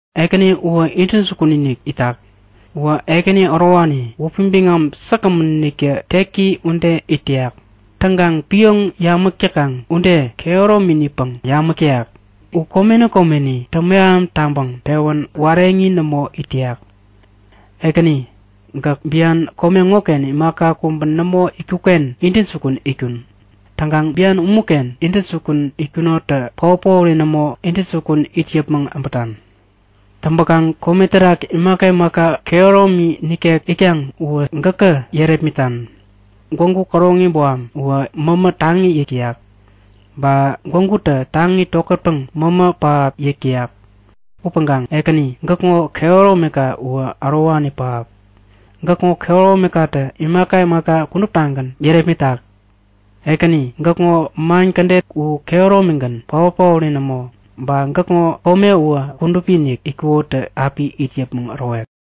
Ekäni uwä intäjukun-inik itak. Uwä ekäni ärowani. Wäpi biŋam säkgämäntä teki ude it täyak. Täŋkaŋ pioŋ yamäk täkaŋ ude kehärominipäŋ yamäk täyak. U komeni komeni täŋmeham täŋpäŋ pewän wareŋi nämo it täyak. Ekäni, gäk bian kome ŋoken imaka kubä nämo itkukken intäjukun itkun. Täŋkaŋ bian umuken intäjukun itkunonitä paot-paori nämo intäjukun it yäpmäŋ äbätan. Täŋpäkaŋ kome terak imaka imaka kehäromi nikek itkaŋ uwä gäkä yärepmitan. Gwägu käroŋi boham uwä mämä taŋi yäk täyak. Ba gwägutä taŋi tokätpäŋ mämä pähap yäk täyak upäŋkaŋ Ekäni, gäkŋo kehäromika uwä ärowani pähap. Gäkŋo kehäromikatä imaka imaka kuduptagän yärepmitak. Ekäni, gäkŋo man kädet u kehäromigän, paot-paori nämo. Ba gäkŋo kome uwä kudupi-inik itkukoniktä api it yäpmäŋ ärowek!